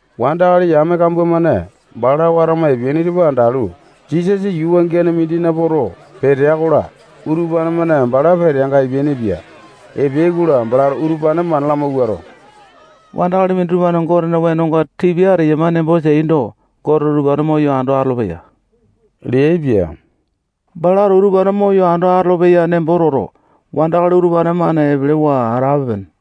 Wandakali yame kambua-mane bala watama epeaini tupa andalu, Jisasa yuu wangiane mindina poto, petea-kola, utupane-mane bala peteanga epeainipia. Epeai-kola, balato utupane mana lamawuato, wandakali minditupa-mane Gotena wenonga tipia ateyama nembo teaindo, Goteto utupane moyo ando atolopeya leaipia. Balato utupane moyo ando atolopeya nembo toto, wandakali utupane-mane epelewa atape-pene.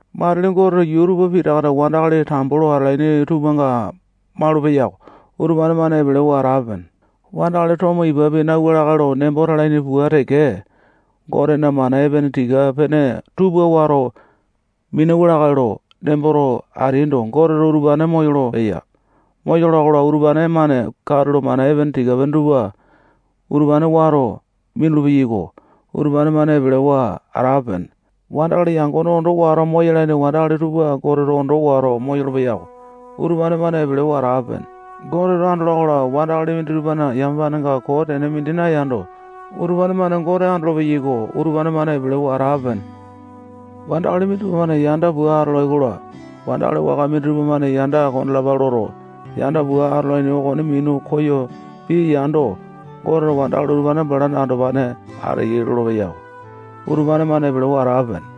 Matili Goteto yuu tupa pitaka wandakali tambo lo atalaini tupanga maulu-peyako. Utupane-mane epelewa atape-pene. Wandakali tomo ipapi nauwa lakae lo nemboto talaini pua teke, Gotena mana epene tika-pene tupa wato minauwa lakae lo nemboto ateaindo, Goteto utupane moyolo-peya. Moyola-kola, utupane-mane katulo mana epene tika-pene utupane wato minulu-peyako. Utupane-mane epelewa atape-pene. Wandakali yangone ondo wato moyalaini wandakali tupa Goteto ondo wato moyolo-peya-ko. Utupane-mane epelewa atape-pene. Goteto andola-kola, wandakali minditupana yamapanenga koo tene mindi nayando, utupane-mane Gote andolo-peyaiko. Utupane-mane epelewa atape-pene. Wandakali minditupa-mane yanda pua atolai-kola, wandakali waka minditupa-mane yanda kondalapa loto, yanda pua atolaini okone minu koyo piya yaindo, Goteto wandakali utupane balana andopane ateyai lolopeya-ko. Utupane-mane epelewa atape-pene.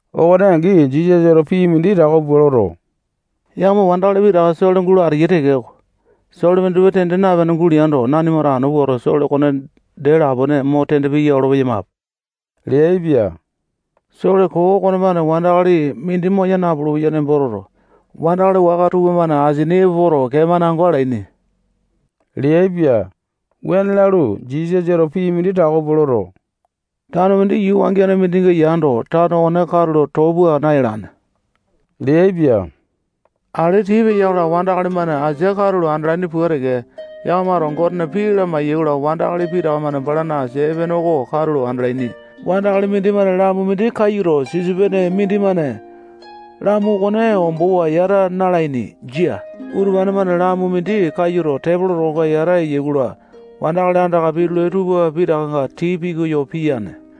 Okone angi, Jisasato pii mindi tako pua loto, yakama wandakali pitakana sole gulo ateyai tekeko, sole minditupa tende napene guleando, nanimato anu puato, sole okone dee lapone mo tende piya olo-peyamape leaipia. Sole koo okonemane wandakali mindi moya napulu-peya nembo toto, wandakali-mane apeyai-kola, wandakali waka tupamane asininga epo poto, kee-mane ango alaini leaipia. Wuane lalu, Jisasato pii mindi tako pua loto, tano mindi yuu wangiane mindinga yando, tano okone katulo too pua nayalane leaipia. Ale tii peya-kola, wandakali-mane asia katulo andalaini pua teke, yakamato Gotena pii lamai-yaikola, wandakali pitaka-mane balana asia epene oko katulo andalaini. Wandakali-mane lamu mindi kayuto, sisopene mindimane lamu okone ombowa yata na-alaini. Jia. Utupane-mane lamu mindi kayuto, tepolo tokonga yata eyai-kola, wandakali andaka pitulai tupa pitakanga tii pikoyo piyane.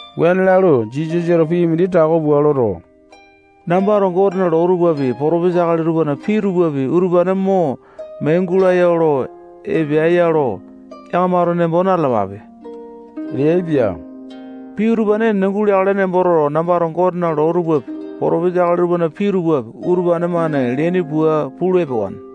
Wuane lalu, Jisasato pii mindi tako pua loto, nambato Gotena loo tupapi, potopesa akali tupana pii tupapi, utupane mo mee gulaya olo epeae-ya lo yakamato nembo na-talapape leaipia. Pii utupane enene guleakale nembo toto, nambato Gotena loo tupapi, potopesa akali tupana pii tupapi, utupane-mane leaini pua pulu epewane.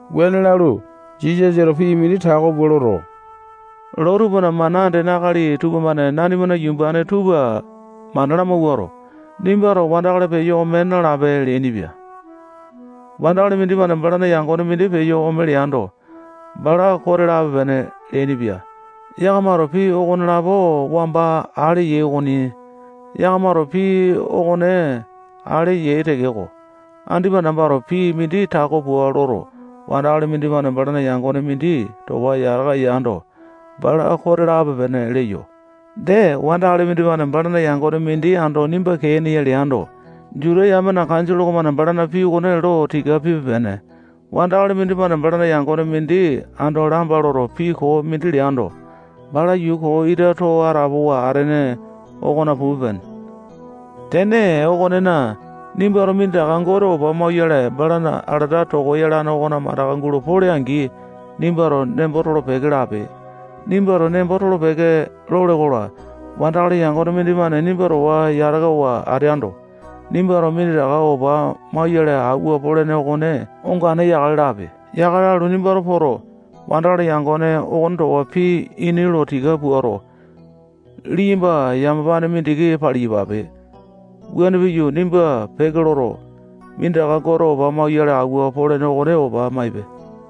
Wuane lalu, Jisasato pii mindi tako pua loto, loo tupana mana andene akali tupamane nanimana yumbane tupa mana lamawuato, nimbato wandakali peyo ome nalape leainipia. Wandakali mindimane balana yangone mindi peyo ome leando, bala kote lape-pene leainipia. Yakamato pii okonelapo wamba ale yai okoni. Yakamato pii okone ale yai tekeko, andipa nambato pii mindi tako pua loto, wandakali mindimane balana yangone mindi towa yataka yando, bala kote lape-pene leyo. Dee, wandakali mindimane balana yangone mindi ando nimba kee ene ya leando, Juta yamena kanjole okomane balana pii okone lo tika pipe-pene. Wandakali mindimane balana yangone mindi ando lamba loto, pii koo mindi leando, bala yuu koo ita too atapowa atene okona pupe-pene. Tene okonena, nimbato minditaka Gote opa mauyale balana alata toko yalane okona mandaka gulo pole-angi, nimbato nembo tolo-peke lape. Nembo tolo-peke lole-kola, wandakali yangone mindimane nimba towa yatakawa ateando, nimbato minditaka opa mauyale awua polene okone ongane yakale lape. Yakale lalu, nimba poto, wandakali yangone okone towa pii ini lo tika puato, liyamba yamapane mindiki paliyapape. Wuane piyu, nimba peke loto, minditaka Gote opa mauyale awua polene okone opa maipe.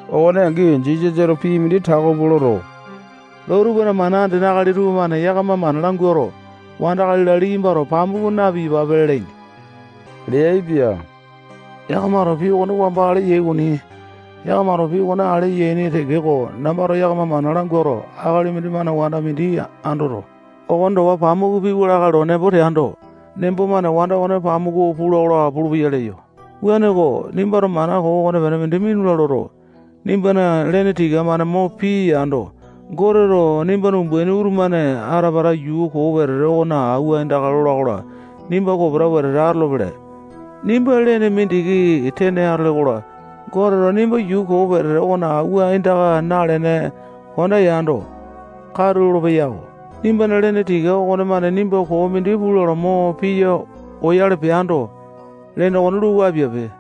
Okone angi, Jisasato pii mindi tako pua loto, loo tupana mana andene akali tupamane yakama mana languato, wanda akali-la, liyambato pamuku na-piyapape lalaini leaipia. Yakamato pii okone wamba ale yai okoni. Yakamato pii okone ale yaini tekeko, nambato yakama mana languato, akali mindimane wanda mindi andoto, okone towa pamuku piwa lakae lo nembo teando, nembo-mane wanda okone pamuku pula-kola pulupeya leyo. Wuaneko, nimbato mana koo okonepene mindi minula loto, nimbana lene tika-mane mo piya yando, Goteto nimbana umbaini utumane ata-pata yuu koo wetete okona awua aindaka lola-kola, nimba kopeta wetete atolopele. Nimba lene mindiki tene atole-kola, Goteto nimba yuu koo wetete okona awua aindaka nalene konda yando, katu lolopeya-ko. Nimbana lene tika okonemane nimbato koo mindi pula lo mo piya oyale peando, lene okone luku apiape.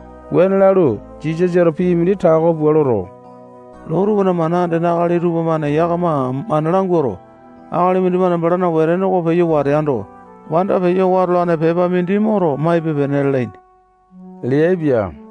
Wuane lalu, Jisasato pii mindi tako pua loto, loo tupana mana andene akali tupamane yakama mana languato, akali mindimane balana wetene oko peyo wateando, wanda peyo watolane pepa mindi moto maipe-pene lalaini leaipia.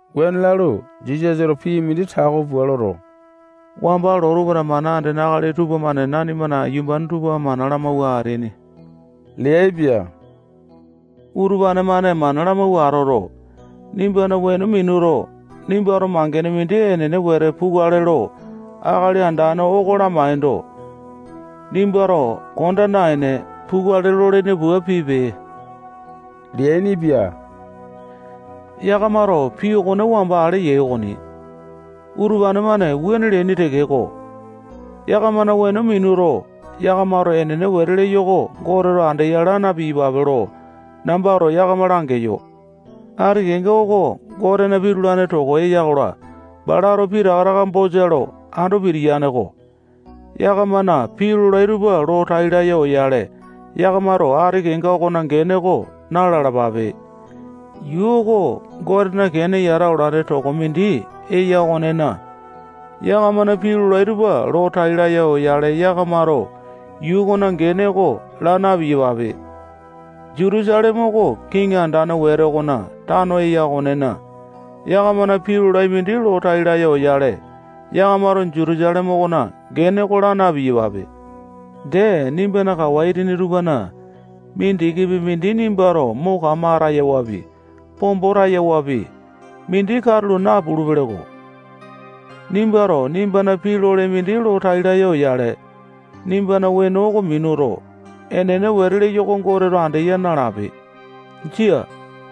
Wuane lalu, Jisasato pii mindi tako pua loto, wamba loo tupana mana andene akali tupamane nanimana yumbane tupa mana lamawua ateaini leaipia. Utupane-mane mana lamawua atoto, nimbana weno minuto, nimbato mangene mindi enene wete pukale lo Akali Andane oko lamaindo, nimbato konda naene, pukale lolene pua pipe leainipia. Yakamato pii okone wamba ale yai okoni. Utupane-mane wuane leaini tekeko, yakamana weno minuto, yakamato enene wete leyo oko Goteto andeya, laa na-piyapape lo nambato yakama langeyo. Ati kenga oko Gotena pitulane toko eya-kola, balato pitaka taka bosa lo ando pitiyane-ko. Yakamana pii lolai tupa lo tai laya oyale yakamato ati kenga okona gene oko na-lalapape. Yuu oko Gotena kene yata olane toko mindi eya okonena, yakamana pii lolai tupa lo tai laya oyale yakamato yuu okona gene oko laa na-piyapape. Jutusaleme oko kiŋi andane wete okona tano eya okonena, yakamana pii lolai mindi lo tai laya oyale, yakamato Jutusaleme okona gene oko laa na-piyapape. Dee, nimbana kawa itini tupana mindikipi mindi nimbato mo kama atayawapi, pombo tayawapi, mindi katulo napulu-peleko. Nimbato nimbana pii lole mindi lo tai laya oyale, nimbana weno oko minuto, enene wete leyo oko Goteto andeya nalape. Jia.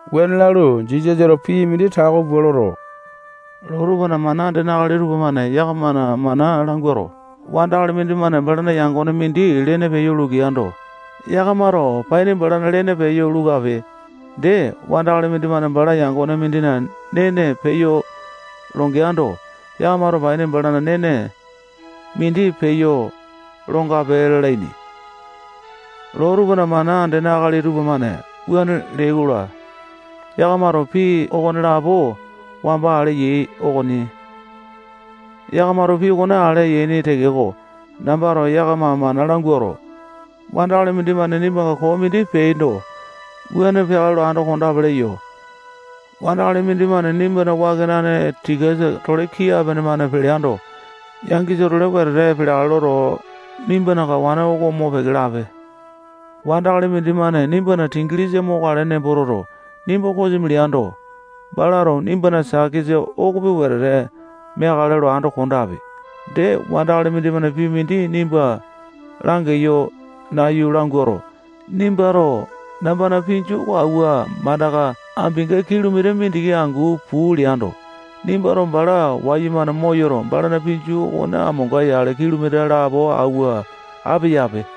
Wuane lalu, Jisasato pii mindi tako pua loto, loo tupana mana andene akali tupamane yakama mana languato, wandakali mindimane balana yangone mindina lene peyo lukeando, yakamato paini balana lene peyo luku ape. Dee, wandakali mindimane balana yangone mindina nene peyo longeando, yakamato paini balana nene mindi peyo longape lalaini. Loo tupana mana andene akali tupamane wuane leai-kola, yakamato pii okonelapo wamba ale yai okoni. Yakamato pii okone ale yaini tekeko, nambato yakama mana languato, wandakali mindimane nimbanga koo mindi peando, wuane peakale lo ando kondape leyo. Wandakali mindimane nimbana wakenane tikasa-tole kii apene-mane peleando, yangisa-tolepi wetete peleakale loto, nimbana kawane oko mopeke lape. Wandakali mindimane nimbana singilisa mokale nembo toto, nimba kosimi leando, balato nimbana sakesa okopi wetete meakale lo ando kondape. Dee, wandakali mindimane pii mindi nimba langeyo nayu languato, nimbato nambana pinju oko awua mandaka ambinga kilomita mindiki angu puu leando, nimbato bala wayumane moyoto, balana pinju okone amonga yale kilomita lapo auwa apeyape.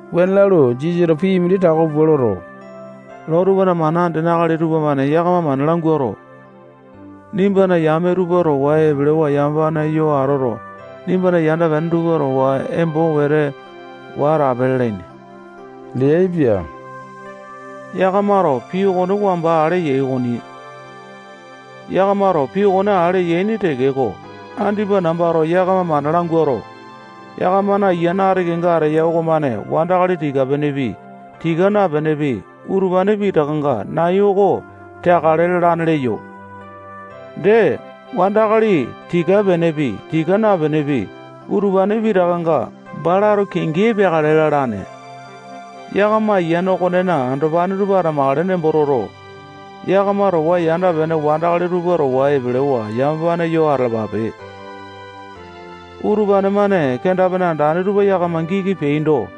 Wuane lalu, Jisasato pii mindi tako pua loto, loo tupana mana andene akali tupamane yakama mana languato, nimbana yame tupa towa epelewa yamapane yo ato, nimbana yanda-pene tupa towa embo wete wa atape lalaini leaipa. Yakamato pii okone wamba ale yai okoni. Yakamato pii okone ale yaini tekeko, andipa nambato yakama mana languato, yakamana ayiane ati kenga ateya okomane wandakali tika-penepi, tika napenepi, utupane pitakanga nai oko teakale lalane leyo. Dee, wandakali tika-penepi, tika napenepi, utupane pitakanga balato kingi epeakale lalane. Yakama ayiane okonena andopane tupa atamakale nembo toto, yakama towa yanda-pene wandakali tupa towa epelewa yamapane yo atalapape. Utupane-mane kenda-pene andane tupa yakama giki peaindo,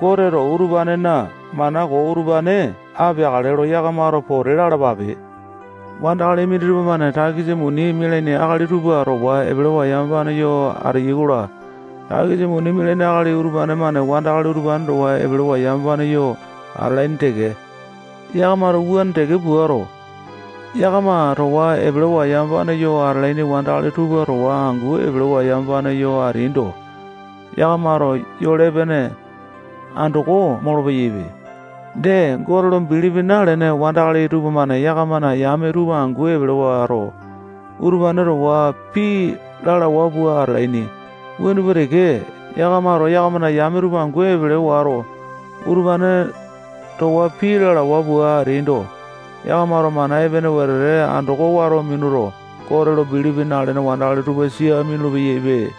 Goteto utupanena mana koo utupane apeakale lo yakamato pote lalapape. Wandakali minditupa-mane takisa muni mialaini akali tupa towa epelewa yamapane yo ateyai-kola, takisa muni mialaini akali utupane-mane wandakali utupane towa epelewa yamapane yo atalaini teke. Yakamato wuane teke puato, yakama towa epelewa yamapane yo atalaini wandakali tupa towa angu epelewa yamapane yo ateaindo, yakamato yole epene andoko molo-peyaipe. Dee, Gote lo bilipi nalene wandakali tupamane yakamana yame tupa angu epele wato, utupane towa pii lalawa pua atalaini. Wuane pua teke, yakamato yakamana yame tupa angu epele wato, utupane towa pii lalawa pua ateaindo, yakamato mana epene wete andoko wato minuto, Gote lo bilipi nalene wandakali tupa sia minulu-peyaipe.